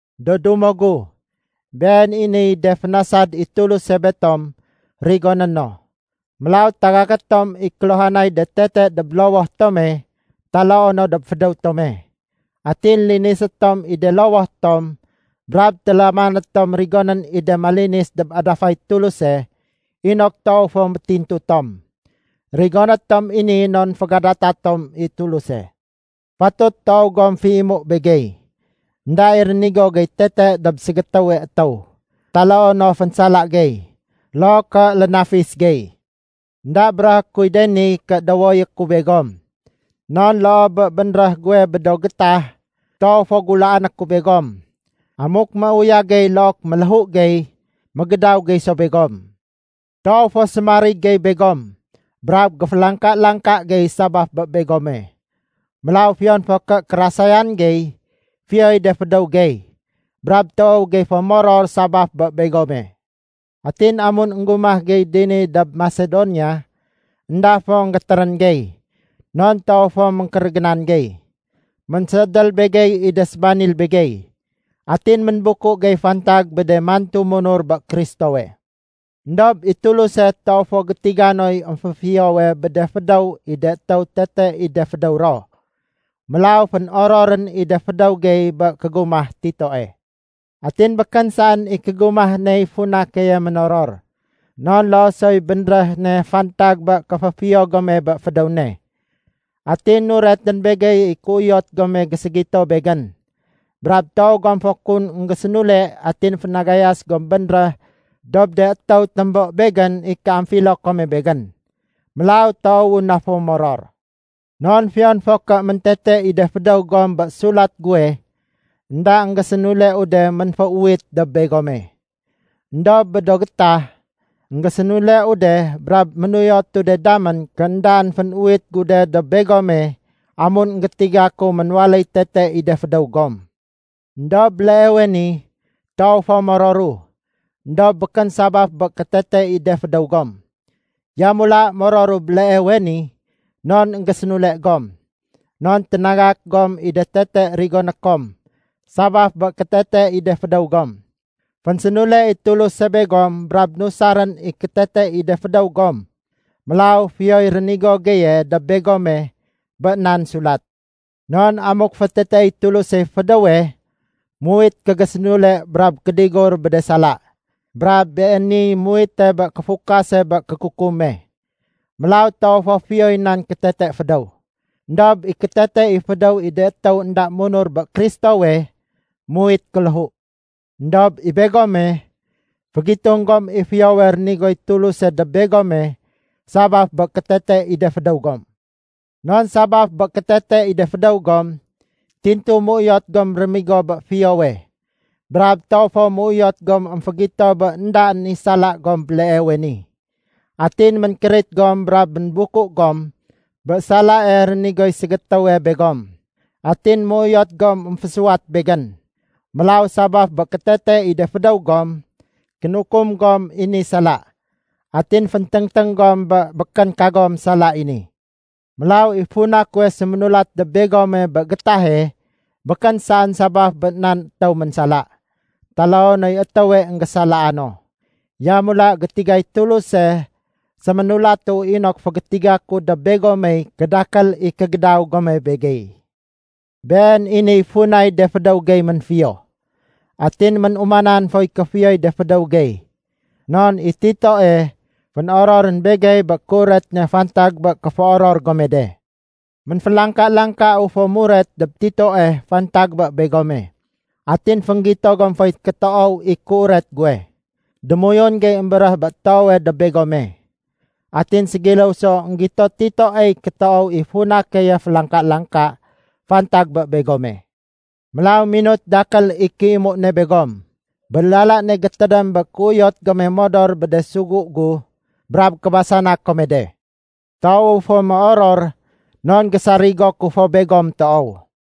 Do dumo gu, been i niy de fénasad i Tuluse betom rigoné no. Mélaw tagaké tom i kéluhanay de tete, dob lowoh tome taloo no dob fédéw tome. Atin linisé tom i de lowoh tom brab télamané tom rigonén i de malinis dob adafay Tuluse inok toow fo métintu tom. Rigoné tom i ni non fégadata tom i Tuluse. Fatut toow gom féimu begey. Enda i rénigo gey tete dob ségétéwe étéw, taloo no fénsala gey, loo ké lénafis gey. Enda béréhé kuy de ni ké dowoyé ku begom. Non loo bé bénréh guwe bé do gétah, toow fo gulaané ku begom. Amuk méuyag gey look méléhu gey, mégédaw gey so begom. Toow fo sémarig gey begom brab géfélangka-langka gey sabaf bé begome. Mélaw fiyon fo ké kérasayan gey, fiyoy de fédéw gey, brab toow gey fo moror sabaf bé begome. Atin amun énggumah gey dini dob Masedonia, énda fo énggétérén gey. Non toow fo ménkérégénan gey. Ménséédél begey i de sébanil begey. Atin ménbuku gey fantag bé de mantu munur bé Kristowe. Endob i Tuluse toow fo gétiga noy émféfiyowe bé de fédéw i de étéw tete i de fédéw ro. Mélaw fénororén i de fédéw gey bé kégumah Titoe. Atin békén saén i kégumah ney funa keye ménoror, non loo soy bénréh ne fantag bé kéféfiyo gome bé fédéw ne. Atin nuretén begey i kéuyot gome géségito begén. Brab toow gom fo kun énggésénule atin fénagayas gom bénréh dob de étéw témbo begén i kéamfilo kome begén. Mélaw toowu na fo moror. Non fiyon fo ké méntete i de fédéw gom bé sulat guwe, énda énggésénuleu de ménféuwit dob begome. Endob bé do gétah, énggésénuleu de brab ménuyotu de damén ké éndaén fénuwit gu de dob begome amun énggétiga ku ménwaléy tete i de fédéw gom. Endob béleewe ni toow fo mororu, éndob békén sabaf bé kétete i de fédéw gom. Yamula mororu béleewe ni non énggésénule gom. Non ténagak gom i de tete rigoné kom sabaf bé kétete i de fédéw gom. Fénsénule i Tuluse begom brab nusarén i kétete i de fédéw gom. Mélaw fiyoy rénigo geye dob begome bé nan sulat. Non amuk féteteéy Tulusey fédéwe, muwit kégésénule brab kédigur bé de sala. Brab beeniy muwite bé kéfukase bé kékukume. Mélaw toow fo fiyoy nan kétete fédéw. Endob i kétete i fédéw i de étéw énda munur bé Kristowe, muwit kéléhu. Endob i begome, fégitung gom i fiyowe rénigoy Tuluse dob begome sabaf bé kétete i de fédéw gom. Non sabaf bé kétete i de fédéw gom, tintu méuyot gom rémigo bé fiyowe, brab toow fo méuyot gom émfégito bé éndaén i sala gom béleewe ni. Atin ménkérit gom brab ménbuku gom bé salae rénigoy ségétéwe begom. Atin méuyot gom émfésuwat begén. Mélaw, sabaf bé kétete i de fédéw gom, kénukum gom i ni sala, atin fénténgténg gom bé békén kagom sala i ni. Mélaw i funa kuwe séménulat dob begome bé gétahe békén saén sabaf bé nan étéw ménsala, taloo noy étéwe énggésalaa no. Yamula gétigay Tuluse séménulatu inok fégétiga ku dob begomey kédakél i kégédaw gome begey. Been i niy funay de fédéw gey ménfiyo. Atin ménumanan foy kéfiyoy de fédéw gey. Non i Titoe fénororén begey bé kéuret ne fantag bé kéféoror gome de. Ménfélangka-langkau fo muret dob Titoe fantag bé begome, atin fénggito gom foy kétoow i kéuret guwe. Démoyun gey émbéréh bé toowe dob begome. Atin ségiléw so énggito Titoey kétoow i funa keye félangka-langka fantag bé begome. Mélaw minut dakél i kéimu ne begom, bé lala ne gétédém bé kéuyot gome modor bé de sugu gu, brab kébasana kome de. Toowu fo méoror non gésarigo ku fo begom toow.